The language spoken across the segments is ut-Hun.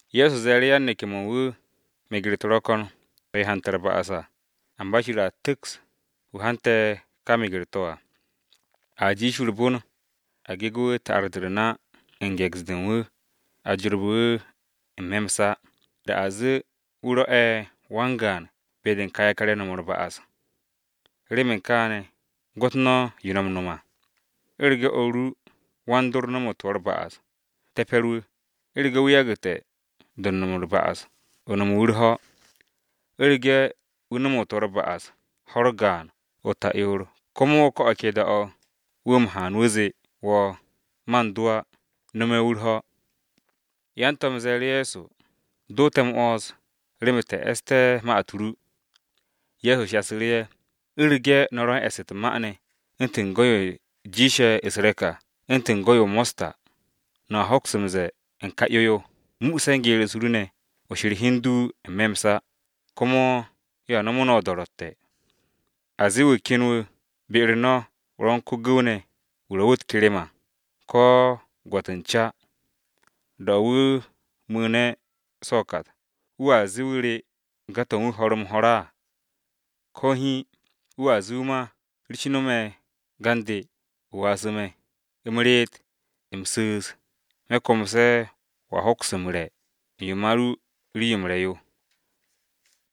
Ye̱so ze̱e̱ru̱ yan-neke̱-mo̱ u̱n wu̱, “Meger-u̱t ro̱ ko̱n to̱ he hante̱ u̱r-ba'as à, amba Shir a tu̱ks ka wu̱ hante̱ ka meger-to̱ à! A jiish wu̱ u̱r-bon a gege̱ wu̱ ta'ar-de u̱r-na u̱n ge̱ks-de u̱n wu̱ a jorbe̱ wu̱ n-me̱ m-sa, da a zee wu̱ rwo̱'e̱ wan-gaan be-de u̱n ka yakar-ye̱ no̱m u̱r-ba'as. Remen kaane̱ gwo̱t no̱ yo no̱ m-no̱m à! “U̱rege̱ o̱r ru wan-dor nomote̱ wo̱ u̱r-ba'as, ru̱ru̱ wu̱, u̱rege̱ wu̱ yagu̱te̱ do̱ u̱n no̱m u̱r-ba'as o no̱me̱ wu̱ u̱r-ho̱. U̱rege̱ wu̱ nomote̱ wo̱ u̱r-ba'as ho̱-u̱r gaan o-ta'yoor, komo ko̱ o̱ ke da-o̱ wu̱ haan wu̱ zee wo̱, ‘Man do̱ á,’ no̱me̱ wu̱ u̱r-ho̱.” Yan-To̱m Ye̱so ze̱e̱ru̱ Go̱s-wu̱, “Do te̱ m-'wo̱ns remen te̱ e̱ste̱ ma-u̱t ru.” Ye̱so shasu̱ru̱, “U̱rege̱ no̱ ro̱ u̱n e̱ss u̱t-ma ne̱ u̱ntu̱n go̱-yo jiishe̱ u̱s-re̱k à u̱ntu̱n go̱-yo mosta, no̱a hoks m-ze̱e̱ u̱n ka 'yo-yo, ‘Muuse̱ u̱s-geer ne̱ o she̱r hi u̱n du n-me̱ m-sa!’ Komo yo a no̱mo̱ no̱ o-do̱ro̱tte̱. “A zee wu̱ ken wu̱ be-u̱r no̱ ro̱ u̱n ko-gu̱w ne̱, wu̱ ro̱ wu̱ u̱t-kerem à, ko gwo̱t u̱n ca. Da-o̱ wu̱ mu̱u̱ne̱ so̱ o-kat, wo̱a zee wu̱ re̱ ga-to̱ u̱n wu̱ ho̱r-m-ho̱r á. Ko̱ hiin! Wo̱a zee wu̱ ma, ‘Rishnu̱ me̱ ga u̱n de, o wasu̱ me̱, u̱m reet, u̱m su̱u̱s, me̱ komse̱ wo̱a hoks m-re̱ u̱n yo ma ru rii-yo m-re̱ yo!’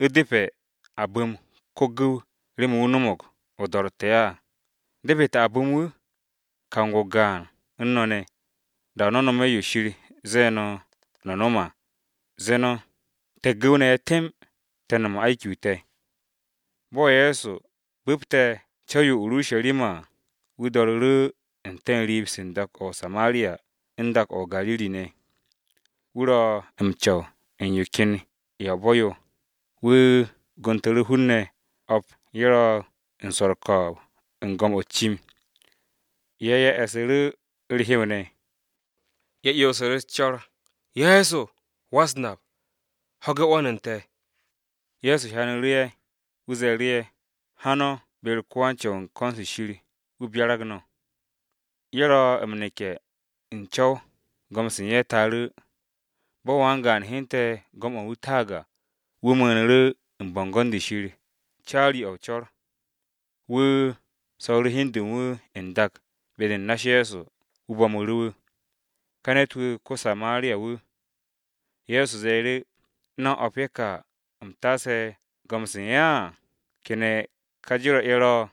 ¿U̱depe̱ a bu̱m ko-gu̱w remen wu̱ no̱mo̱g o-do̱ro̱tte̱ á, depete̱ a bu̱m wu̱? Kang-o gaan u̱n no̱ ne̱, da-o̱ no̱ no̱me̱ yo Shir ze̱e̱ no̱, no̱ no̱m à, ze̱e̱ no̱, ‘Te̱ gu̱w-ne̱ ye̱ temb, te̱ u̱n no̱m se̱nge̱-m te̱.’” Bo̱ Ye̱so bu̱pte̱ co̱w-yo o-Urusharima à, wu̱ do̱ru̱ru̱ u̱n te̱ riib-se u̱n dak-o̱ o-Samariya u̱n dak-o̱ o-Gariri ne̱. Wu̱ ro̱ m-co̱w u̱n yo ken ya-o-bo̱ yo, wu̱ gontu̱ru̱ hun-ne̱ o̱p ye̱ ro̱ u̱n swo̱ u̱r-ko̱o̱b u̱n go̱m-o̱ u̱t-cim. Ye̱ e̱su̱ru̱ u̱r-hew ne̱. Ye̱ 'yonsu̱ru̱ u̱s-co̱r, “Ye̱so! Go̱s-wu̱! Ho̱ge̱ 'wo̱n u̱n te̱!” Ye̱so hyanu̱ru̱ ye̱, wu̱ ze̱e̱ru̱ ye̱, “Ha no̱ be-u̱r ko-wan-Co̱w u̱n ko̱n-se Shir wu̱ byarag no̱.” Ye̱ ro̱ m-neke̱ u̱n co̱w go̱m-se u̱n ye̱ taaru̱. Bo̱ wan-gaan hyente̱ go̱m-o̱ u̱n wu̱ taag à, wu̱ mu̱u̱nu̱ru̱ u̱n bo̱ngo̱n-de Shir u̱n co̱r caari. Wu̱ so̱ru̱ hi u̱n de u̱n wu̱ n-dak be-de u̱n na-u̱s Ye̱so, wu̱ bo̱mu̱ru̱ wu̱. Ka ne̱t-wu̱ ko-Samariya-wu̱. Ye̱so ze̱e̱ru̱, “Ne̱n o̱p ye̱ ka u̱m taase go̱m-se u̱n ye̱ à, ¿kene̱ ka jero̱-ye̱ ro̱?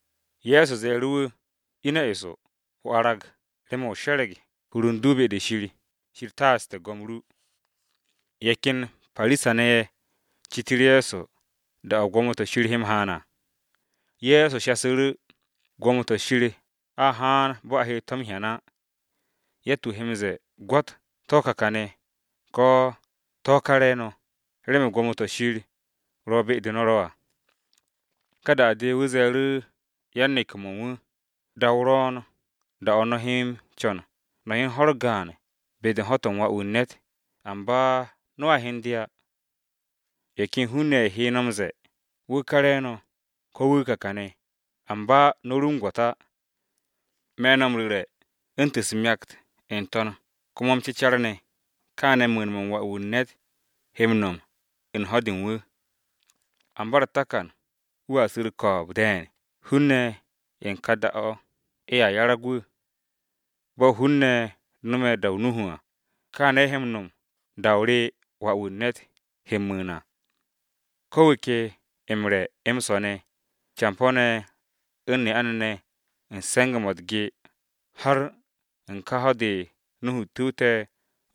Ye̱so ze̱e̱ru̱ wu̱, “Ine̱ eso, o arag remen o she̱re̱g hur u̱n du be-de Shir, Shir taaste̱ go̱m-o ru.” Ye̱ ken Parisa-ne̱ ye̱ citu̱ru̱ Ye̱so da-o̱ gwo̱mo-to̱ Shir he m-haan à. Ye̱so shasu̱ru̱: “Gwo̱mo-to̱ Shir a haan bo̱ a he to̱ m-hyan á. Yatt-wu̱ he m-ze̱e̱, ‘Gwo̱t, to̱ ka kane̱!’ Ko̱, ‘To̱ ka re̱e̱no̱!’ Remen gwo̱mo-to̱ Shir ro̱ be-de no̱ ro̱ à.” Ka da-de wu̱ ze̱e̱ru̱ yan-neke̱-mo̱ u̱n wu̱, “Da-o ro̱o̱n da-o̱ no̱ he m-co̱n no̱ hyen ho̱-u̱r gaan be-de u̱n ho̱-to̱ u̱n Wà-wu̱ u̱n ne̱t à, amba no̱a hyen de á. Ye̱ ken hun-ne̱ ye̱ he no̱ m-ze̱e̱, ‘Wà-wu̱ u̱n ne̱t, Wu̱ ká re̱e̱no̱!’ Ko̱, ‘Wu̱ kà kane̱!’ Amba no̱ ru m-gwo̱t á. Me̱ no̱ m-ru̱re̱ u̱ntu̱n u̱s-myakt n-to̱n komo m-cecar ne̱, kaane̱ mu̱u̱n-mo̱ u̱n Wà-wu̱ u̱n ne̱t, he m-no̱m u̱n ho̱-de u̱n wu̱. Amba u̱r-takan Wà-wu̱ u̱n ne̱t wu̱a su̱ u̱r-ko̱o̱b de̱e̱n hun-ne̱ ye̱ u̱n ka da-o̱, ye̱a 'yarag wu̱. Bo̱ hun-ne̱ no̱me̱ da-o Nuhu à kaane̱ ye̱ he m-no̱m da-o̱ re Wà-wu̱ u̱n ne̱t he m-mu̱u̱n à. Ko̱ wu̱ ke m-re̱ m-swo̱ ne̱, campo̱-ne̱ u̱n ne'a-ne̱ ne̱ u̱n se̱nge̱-mo̱ u̱t-ge, har u̱n ka ho̱-de Nuhu tu̱wte̱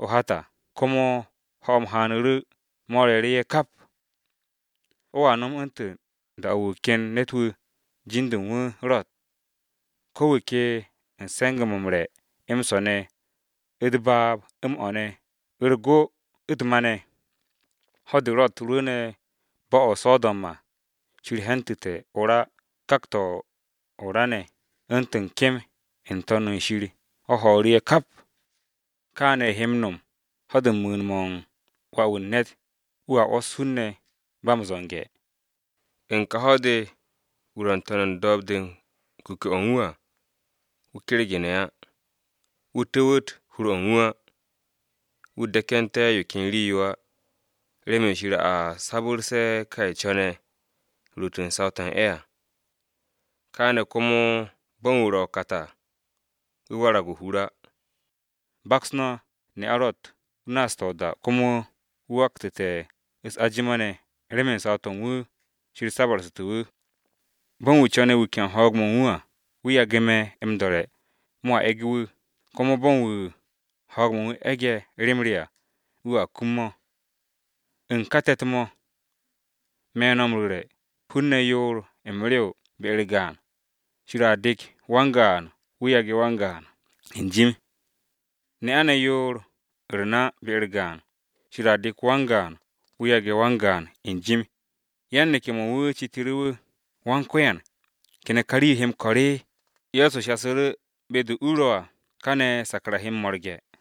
o-hat à, komo ho̱-m haanu̱ru̱ mo̱ re̱e̱ru̱ ye̱ kap. O̱a no̱m u̱ntu̱n da-o̱ wu̱ ken ne̱t-wu̱ jin-de u̱n wu̱ Ro̱t. Ko̱ wu̱ ke u̱n se̱nge̱-mo̱ m-re̱ m-swo̱ ne̱, u̱t-baab, m-o̱ ne̱, u̱r-go, u̱t-ma ne̱. Ho̱-de Ro̱t rwu̱u̱ne̱ bo̱-o̱ o-So̱do̱m à, Shir hentu̱te̱ o-ra u̱n kak-to̱ o-ra ne̱ u̱ntu̱n kem n-To̱n u̱n shir o̱ ho̱o̱ru̱ ye̱ kap. Kaane̱ he m-no̱m ho̱-de u̱n mu̱u̱n-mo̱ u̱n Wà-wu̱ u̱n ne̱t wu̱a 'wo̱s hun-ne̱ ba m-zo̱nge̱. “U̱n ka ho̱-de wu̱ ro̱ n-to̱n u̱r-do̱o̱b de u̱n kuke̱-o̱ u̱n wu̱ à, wu̱ kergu̱ne̱ á, wu̱ cu̱w hur-o̱ u̱n wu̱ á, wu̱ dekente̱ yo ken rii-yo á, remen Shir a sabu̱rse̱ ka ye̱ co̱ne̱ ruut u̱n saw-to̱ u̱n ye̱ à, kaane̱ komo bo̱ u̱n wu̱ ro̱ o-kat à, wu̱a warag o-hur á. Baks no̱ ne'a Ro̱t wu̱ naaste̱ o-da komo wu̱ wakte̱ u̱s-ajima ne̱ remen saw-to̱ u̱n wu̱, Shir sabu̱rsu̱te̱ wu̱. Bo̱ u̱n wu̱ co̱ne̱ wuke̱ u̱n ho̱o̱g-mo̱ u̱n wu̱ à, wu̱ yage̱ me̱ m-do̱re̱ mo̱a e̱ge̱ wu̱, komo bo̱ u̱n wu̱ ho̱o̱g-mo̱ u̱n wu̱ e̱ge̱ rem re à, wu̱a kum mo̱. U̱n ka te̱t-mo̱, me̱ no̱ m-ru̱re̱, hun-ne̱ yoor m-rew be-u̱r gaan: Shir a dek wan-gaan, wu̱ yage̱ wan-gaan n-jim. Ne'a-ne̱ yoor u̱r-na be-u̱r gaan, Shir a dek wan-gaan, wu̱ yage̱ wan-gaan n-jim.” Yan-neke̱-mo̱ u̱n wu̱ citu̱ru̱ wu̱, “Go̱s-wu̱, ¿kene̱ ka rii-yo he m-ko̱r?” Ye̱so shasu̱ru̱, “Be-de u-u̱r ro̱ à, kane̱ sakra he m-mo̱rge̱.”